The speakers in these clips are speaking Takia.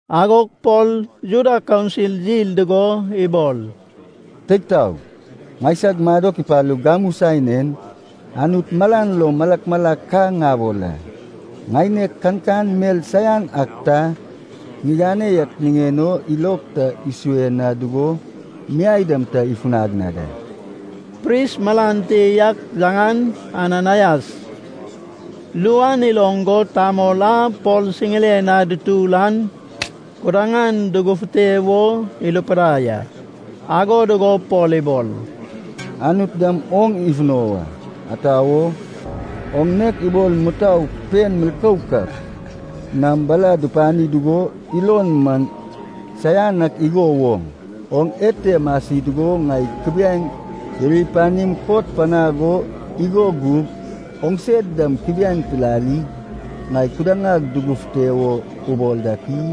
Agog Pol Juda kaunsil yil dugo ibol, “Teig taog, ŋaisag madok ipalug gamu saen en, Anut malan lo malak malak ka ŋabol a, ŋaineg kankan mel saian ak ta ŋigane yak niŋen o ilog ta isue na dugo miai dam ta ifunag na da.” Pris malan te yak, yaŋan Ananaias, ru an iloŋ go tamol a Pol siŋiren na dutur an kudaŋan dugufute wo irupidai a. Ago dugo Pol ibol, “Anut dam oŋ ifuno wa. Ata wo? Oŋ nek ibol mutou pen milkouk ak nam bala dupani dugo ilon man saianan ak igo woŋ. Oŋ ete masi dugo ŋai kubiaeŋ iri panim kot panag o igo gug oŋse dam kubiaeŋ pilalig, ŋai kudaŋag dugufute wo ubol dak i?”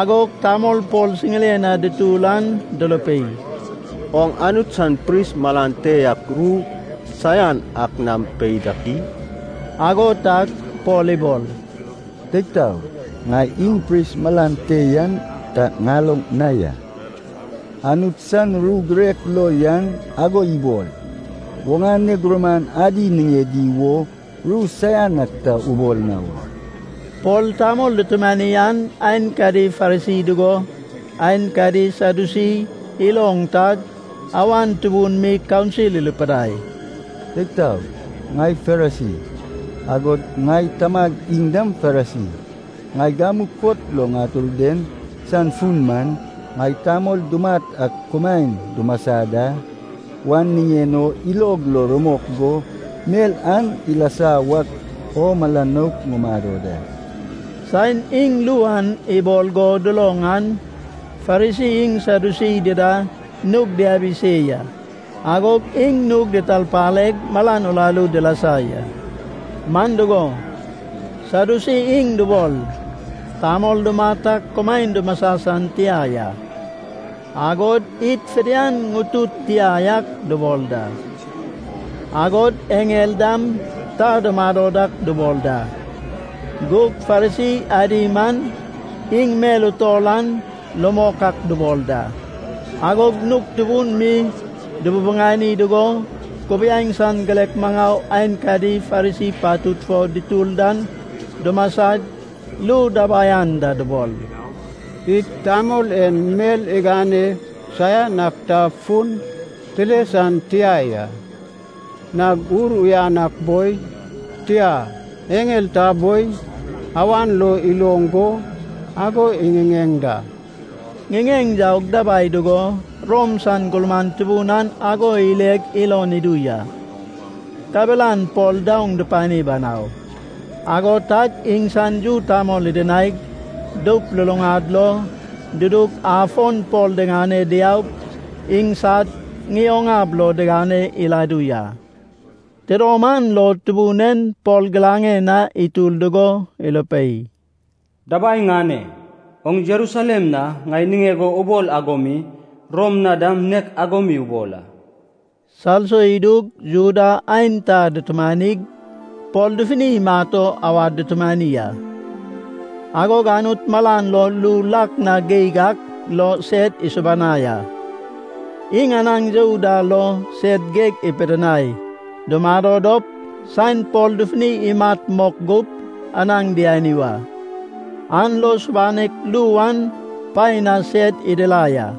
Agog tamol Pol siŋiren na dutur an durupei, “Oŋ Anut san pris malan te yak ru saian ak nam pei dak i?” Ago tag Pol ibol, “Teig taog, ŋai iŋ pris malan te yan ta ŋaloŋ na ya. Anut san ru girek lo yan ago ibol, ‘Oŋane gurman adi niŋedi wo ru saian ak ta ubol na wa.’” Pol tamol dutumani an aenkadi Farisi dugo aenkadi Sadyusi iloŋ tag, awan tubun mi kaunsil irupidai, “Teig taog! Ŋai Farisi, agod ŋai tamag iŋ dam Farisi. Ŋai gamu kot lo ŋatur den san fun man, ŋai tamol dumat ak kumaen dumasa da wan niŋen o ilog lo rumok go, mel an ilasa wak o mala nouk ŋumado da.” Saen iŋ ru an ibol go duloŋ an Farisi iŋ Sadyusi dida nug diabi se ya. Agog iŋ nug ditarpaleg malan uraru dilasa ya. Man dugo, Sadyusi iŋ dubol, tamol dumat ak kumaen dumasa san tia ya. Agod id fidian ŋutud tia yak dubol da. Agod eŋel dam ta dumado dak dubol da. Gug Farisi adi man iŋ mel utol an rumok ak dubol da. Agog nug tubun mi dububuŋani dugo kubiaeŋ san girek maŋau aenkadi Farisi patud fo dutur dan dumasag, ru dabai anda dubol, “Id tamol en mel igane saian ak ta fun tile san tia ya. Nag ur uyan ak boi, tia eŋel ta boi, awan lo iloŋ go ago iŋiŋeŋ da!” Ŋiŋeŋ yaug dabai dugo Rom san gurman tubun an ago ileg ilon idu ya. Kabelan Pol daoŋ dupani banau. Ago tag iŋsan yu tamol idinaig, doup luluŋad lo dudug, afon Pol diŋane diaug iŋsad ŋioŋ ab lo digane iladu ya. Tidom an lo Tubun en Pol giraŋen na itur dugo irupei, “Dabai ŋane! Oŋ Jerusalem na ŋai niŋeg o ubol ago mi Rom na dam nek ago mi ubol a.” Salso idug Juda aenta dutumanig Pol dufuni imat o awad dutumani a. Agog Anut malan lo ru lak na geig ak lo sed isubanai a. Iŋ anaŋ you da lo sed geg ipidinai dumado dop, saen Pol dufuni imat mok gup, anaŋ diani wa. An lo subanek ru an paen na sed idirai a.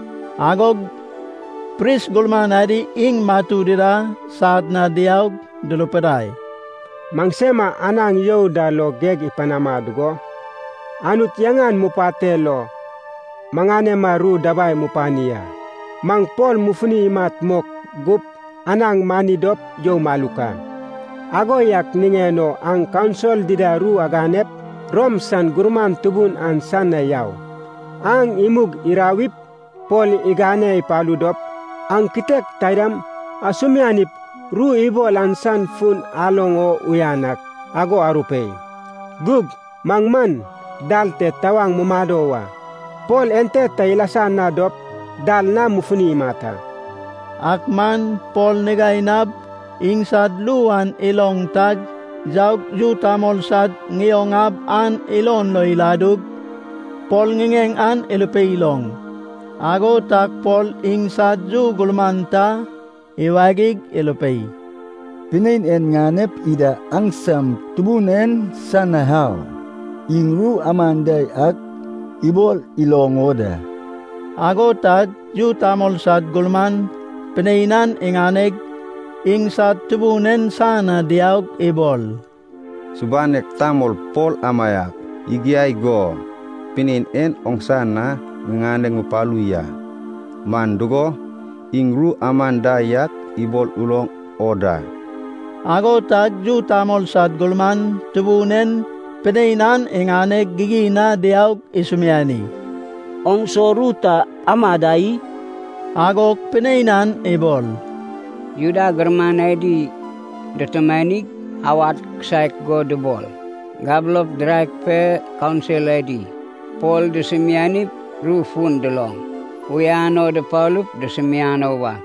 Agog pris gurman adi iŋ matu dida sad na diaug durupidai, “Maŋsema anaŋ you da lo geg ipanama dugo Anut yaŋan mupateg lo maŋanema ru dabai mupani a. Maŋ Pol mufuni imat mok gup anaŋ mani dop you maluk a. Ago yak niŋen o aŋ kaunsil dida ru aganep Rom san gurman tubun an san na yau. Aŋ imug irawip, Pol igane ipalu dop aŋ kitek taidam asumianip ru ibol an san fun aloŋ o uyan ak ago arupei. Gug maŋ man dal te tawaŋ mumado wa. Pol ente ta ilasa na dop dal na mufuni imat a.” Ak man Pol nigainab iŋsad ru an iloŋ tag yaug, yu tamol sad ŋioŋ ab an ilon lo iladug, Pol ŋiŋeŋ an irupei iloŋ. Ago tag Pol iŋsad yu gurman ta iwagig irupei, “Pinein en ŋanep ida aŋsam tubun en san na au. Iŋ ru aman da yak ibol iloŋ o da.” Ago tag yu tamol sad gurman pinein an iŋaneg iŋsad tubun en san na diaug ibol, “Subanek tamol Pol amaiak igiag go pinein en oŋsa na ŋiŋane ŋupalu ya. Man dugo, iŋ ru aman da yak ibol uloŋ o da.” Ago tag yu tamol sad gurman tubun en pinein an iŋaneg gigin na diaug isumiani, “Oŋ so ru ta ama da i?” Agog pinein an ibol, “Juda gurman adi dutumanig awad kisaek go dubol. Gabulop diraek pe kaunsil adi Pol dusumianip ru fun duloŋ uyan o dupalup dusumiano wa.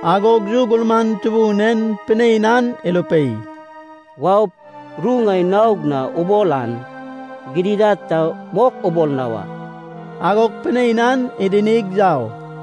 Agog yu gurman tubun en pinein an irupei, “Waup, ru ŋai naog na ubol an gidigidad ta mok ubol na wa.” Agog pinein an idinig yau.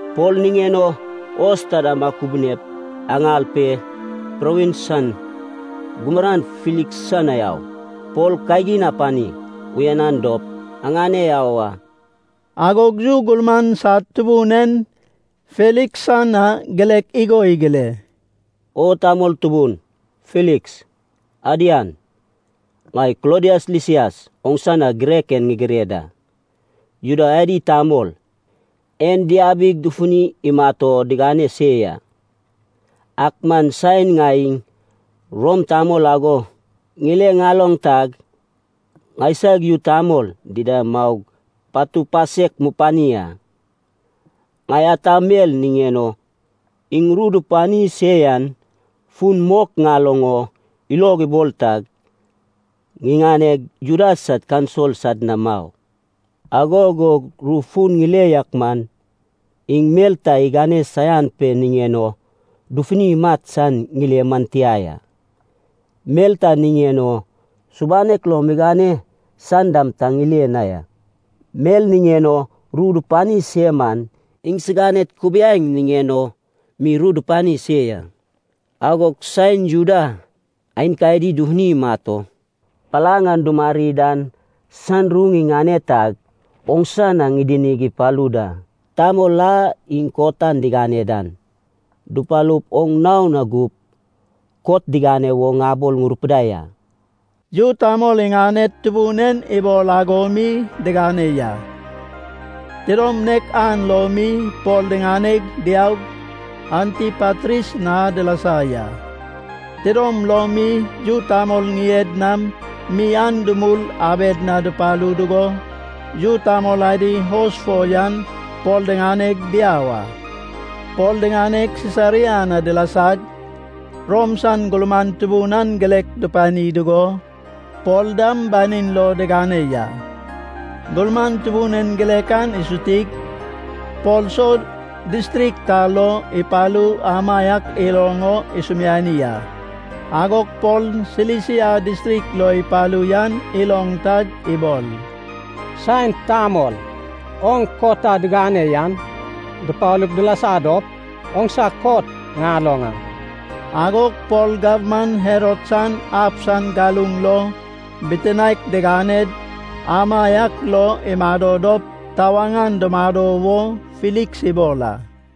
Pol niŋen o hos taida akubuniaip, aŋal pe, provins san gurman Filiks san na au. Pol kagin apani uyanan dop aŋane au a.” Agog yu gurman sad tubun en Filiks san na girek igo igire, “O tamol tubun, Filiks. Adian. Ŋai Klodias Lisias oŋsa na girek en ŋigire da. Juda adi tamol en diabig dufuni imat o digane se ya. Ak man saen ŋai iŋ Rom tamol ago ŋile ŋaloŋ tag, ŋaisag yu tamol dida maug patu pasek mupani a. Ŋai ata mel niŋen o iŋ ru dupani se yan fun mok ŋaloŋ o ilog ibol tag, ŋiŋaneg, Juda sad kaunsil sad na mau. Ago gug ru fun ŋile yak man, iŋ mel ta igane saian pe niŋen o dufuni imat san ŋile man tia ya. Mel ta niŋen o subanek lo migane san dam ta ŋile na ya. Mel niŋen o ru dupani se man iŋsiganed kubiaeŋ niŋen o mi ru dupani se ya. Agog saen Juda aenkadi dufuni imat o palaŋ an dumari dan san ru ŋiŋane tag, oŋsa na ŋidinig ipalu da. Tamol a iŋ kot an digane dan, dupalup oŋ nao na gup, kot digane wo ŋabol ŋurupidai a.” Yu tamol iŋaned tubun en ibol ago mi digane ya. Tidom nek an lo mi Pol diŋaneg diaug, Antipatris na dilasa ya. Tidom lom mi yu tamol ŋied nam mi an dumul abed na dupalu dugo, yu tamol adi hos fo yan Pol diŋaneg diau a. Pol diŋaneg Sisaria na dilasag, Rom san gurman tubun an girek dupani dugo, Pol dam banin lo digane ya. Gurman tubun en girek an isutig, Pol so distrik ta lo ipalu amaiak iloŋ o isumiani a. Agog Pol Silisia distrik lo ipalu yan iloŋ tag ibol, “Saen tamol oŋ kot a digane yan dupalup dilasa dop, oŋsa kot ŋaloŋ a.” Agog Pol gabman Herod san ab san galuŋ lo bitinaek diganed amaiak lo imado dop tawaŋ an dumado wo Filiks ibol a.